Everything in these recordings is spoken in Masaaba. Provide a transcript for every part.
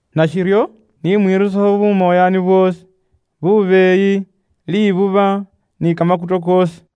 Nashiryo, ni mwirusekho bumoyaani bwoosi, bubeeyi, libuba, ni kamakuto koosi.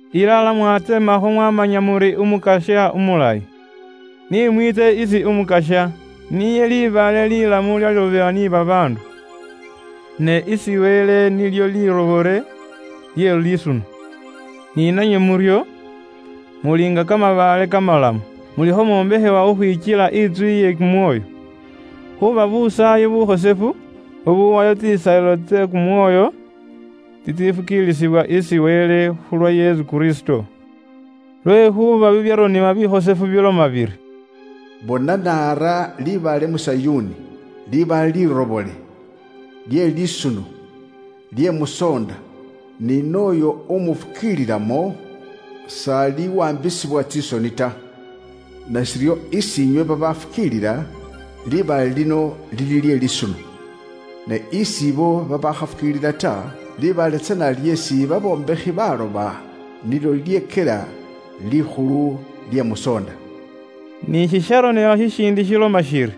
Ilala mwatsemakho mwamanya muri Umukasya umulayi. Ni mwiitse isi Umukasya, niye libaale lilamu lyeesi babaandu bekaana, ne isi Wele nilyo liirobole, lye liisuno. Ni nanywe muryo, muli nga kamabaale kamalamu, mulikho mwombekhewa khukhwikyela intsu iye kumwoyo, khuuba busaayi bukhosefu, bubuuwayo tsisaayilo tse kumwoyo tsitsifukiilisibwa isi Wele khulwa Yesu Kristo. Lwekhuuba bibyaronebwa bikhosefu biloma biri, “Bona, naara libaale mu Sayuuni, libaale lirobole, lye lisuno, lye mu soonda, ni nooyo umufukiililamo, s'aliwaambisibwa tsisoni ta.” “Nashiryo, isi inywe babafukiilila, libaale lino lili lye lisuno. Ne isi ibo babaakhafukiilila ta, libaale tsana lyeesi babombekhi bekaana nilyo lilyekyela likhulu lye musoonda.” Ni shisharonebwa shishiindi shiloma shiri,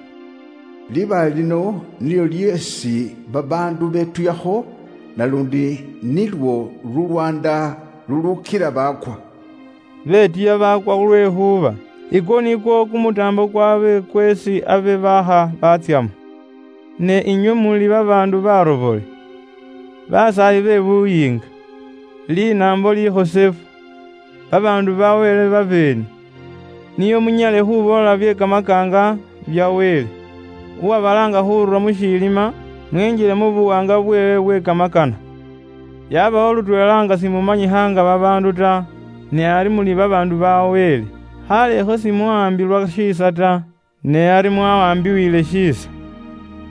“Libaale lino nilyo lyeesi babaandu betuyakho naluundi nilwo lulwaanda luluukila baakwa.” Betuya baakwa lwekhuuba ikwo nikwo kumutaambo kwaabwe kweesi abe baakha batsyamo. Ne inywe muli babaandu barobole, basaayi be buyiinga, linaambo likhosefu, babaandu ba Wele babeene, nio munyale khuboola bye kamakaanga bya Wele uwabalaanga khurura mu shilima mwinjile mu buwaanga bweewe bwe kamakana. Yabawo lutweela nga simumanyikha nga babaandu ta, ne ari muli babaandu ba Wele. Khaalekho simwawaambilwa shiisa ta, ne ari mwawaambiwiile shiisa.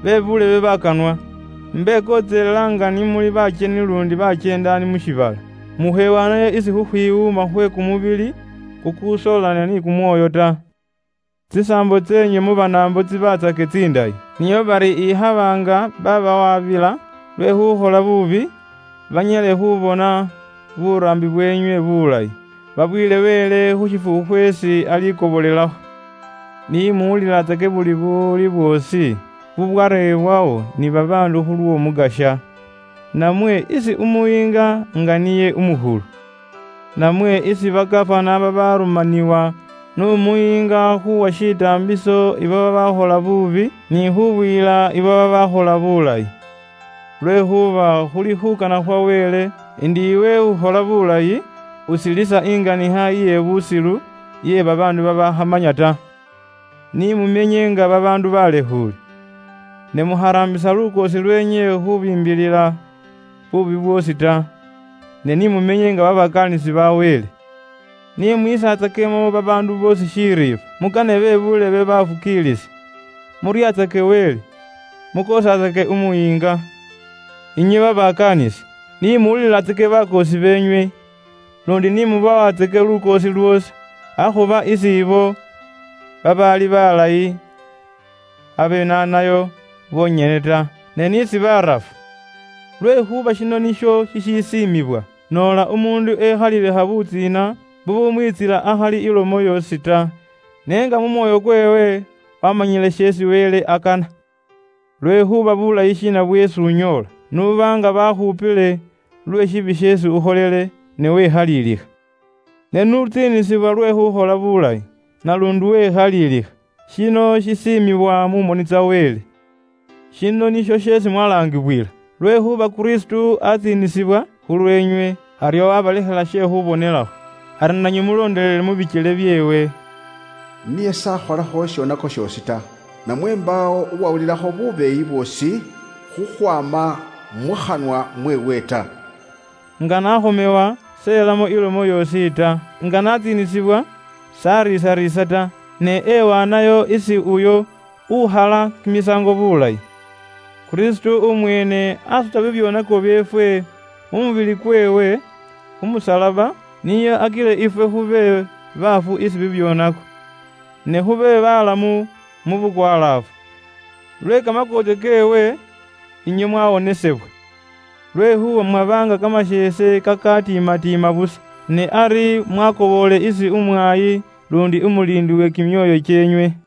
Bebuulebe bakanwa, imbekontselela nga ni muli bakyeni luundi bakyeendaani mu shiibala, mukhewaanayo isi khukhwiwuuma khwe kumubili kukusoolana ni kumwoyo ta. Tsisaambo tseenywe mu Banaambo tsibatsake tsindayi, nio bari ikhaba nga babawaabila lwe khukhola buubi, banyale khubona buraambi bweenywe bulayi, babuyile Wele khu shifukhu khweesi alikobolelakho. Ni muwulilatsake buli buwuli bwoosi bubwarebwawo ni babaandu khulw'Omukasya. Namwe isi umuyiinga nga niye umukhulu, namwe isi ba gafana babarumaniwa n'umuyiinga khuuwa shitaambiso abo babaakhola buubi, ni khubuyila ibo babaakhola biilayi. Lwekhuuba khuli khuukana khwa Wele ndi iwe khuukhola buulayi usilisa inganikha iye busilu iye babaandu babaakhamanya ta. Ni mumenye nga babaandu baalekhuule, ne mukharaambisa lukoosi lweenywe khubiimbilila buubi bwoosi ta. Ne ni mumenye nga babakaanisi ba Wele. Ni mwisatsakemo babaandu boosi shiriifwa, mukanaatsake be buulebe baafukiilisi, muryatsake Wele, mwisatsakemo umuyiinga lukoosi. Inywe babakaanisi, ni muwulilatsake bakoosi beenywe, luundi ni mubawatsake lukoosi lwoosi, akhuba isi ibo babaali balayi babenaanayo bonyene ta, ne n'isi barafu. Lwekhuuba shino nisho shishisiimibwa, noola umuundu ekhaliilikha butsiina bubumwiitsila akhali ilomo yoosi ta, ne nga mu mwoyo kweewe waamanyile sheesi Wele akana. Lwekhuuba buulayi shiina bweesi unyoola, n'uba nga baakhupile lwe shishoonako sheesi ukholele, ne wekhaliilikha? Ne n'utsiinisibwa lwe khuukhola buulayi, naluundi wekhaliilikha, shino shisiimibwa mu moni tsa Wele. Shino nisho sheesi mwalaangibwila, lwekhuuba Kristo aatsiinisibwa khulweenywe, aryo waabalekhela she khuubonelakho, ari nanywe mulondelele mu bikyele byeewe. Niye s'akholakho shishoonako shoosi ta, namwe mbaawo uwawulilakho bubeeyi bwoosi khukhwaama mukhanwa mweewe ta. Nga n'akhomewa s'elamo ilomo yoosi ta; nga n'atsiinisibwa s'ariisariisa ta, ne ewaanayo isi uyo ukhala kimisaango bulayi. Kristo umweene asuta bibyoonako byeefwe mu mubili kweewe khu musalaba, nio akile ifwe khube bafu isi bibyoonako, ne khube balamu mu bukwalaafu. Lwe kamakoontsyo keewe, inywe mwawonesebwa. Lwekhuuba mwaba nga kamasheese kakatiimatiima busa, ne ari mwakoboole isi umwaayi luundi umuliindi we kimyoyo kyeenywe.